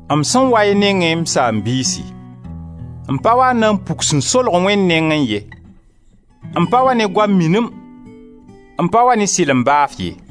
M sẽn wa y nengẽ, m saam-biisi, m pa wa n na puk sẽn solg Wẽnd nengẽ ye, m pa wa ne goam minim, m pa wa ne sɩlem baaf ye.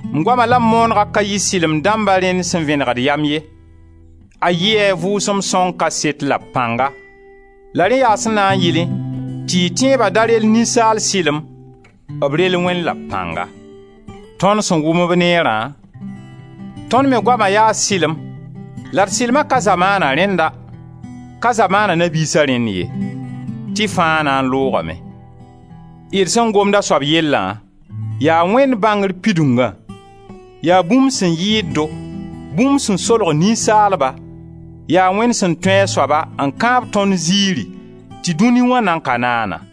M goama la m moonegã ka yɩ sɩlem dãmba rẽnd sẽn vẽnegd yam ye. A yɩɩ a Vʋʋsem Sõng kaseto la b pãnga, la rẽ yaa sẽn na n yɩlẽ tɩ y tẽeba da rel ninsaal sɩlem, a rel Wẽnd la b pãnga. Tõnd sẽn wʋm-b neerã, tõnd me goama yaa sɩlem la d sɩlma ka zamaana rẽnda, ka zamaana na-biisa rẽnd ye, tɩ fãa na n loogame. D sẽn gomd a soab yellã, yaa Wẽnd bãngr pidungã, yaa bũmb sẽn yɩɩd-do, bũmb sẽn solg ninsaalba, yaa Wẽnd sẽn tũ a soaba n kãab tõnd ziiri tɩ dũni wã nan ka naana.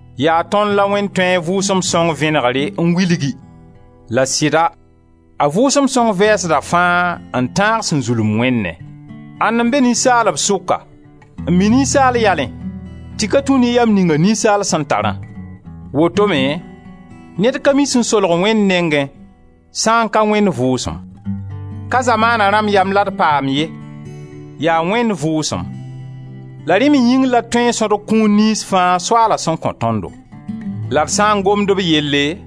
Yaa tõnd la Wẽnd tũ a Vʋʋsem Sõng vẽnegre n wilgi, la sɩda, a Vʋʋsem Sõng vɛɛsda fãa n tãag sẽn zulem Wẽnnẽ. Ãnd n be ninsaalb sʋka n mi ninsaal yalẽ tɩ ka tũ ne yam ninga ninsaal sẽn tarã? Wot-ome ned ka mi sẽn solg Wẽnd nengẽ sã n ka Wẽnd Vʋʋsem. Ka zamaana rãmb yam la d paam ye, yaa Wẽnd Vʋʋsem. La rẽ me yĩng la d tõe n sõdg kũun niyns fãa Soaala sẽn kõ tõndo. La d sã n gomd b yelle,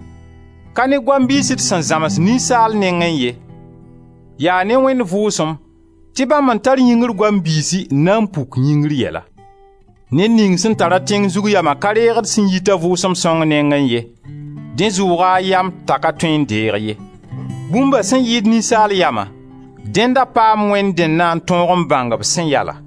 ka ne goam biis d sẽn zãms ninsaal nengẽ ye, yaa ne Wẽnd Vʋʋsem tɩ bãmb n tar yĩngr goam biisi n na n puk yĩngr yɛla. Ned ning sẽn tara tẽng zug yama ka reegd sẽn yita Vʋʋsem Sõng nengẽ ye: dẽ zʋʋga a yam t'a ka tõe n deeg ye. Bũmba sẽn yɩɩd ninsaal yama, dẽnd a paam Wẽnd dẽnna n tõog n bãng b sẽn yala.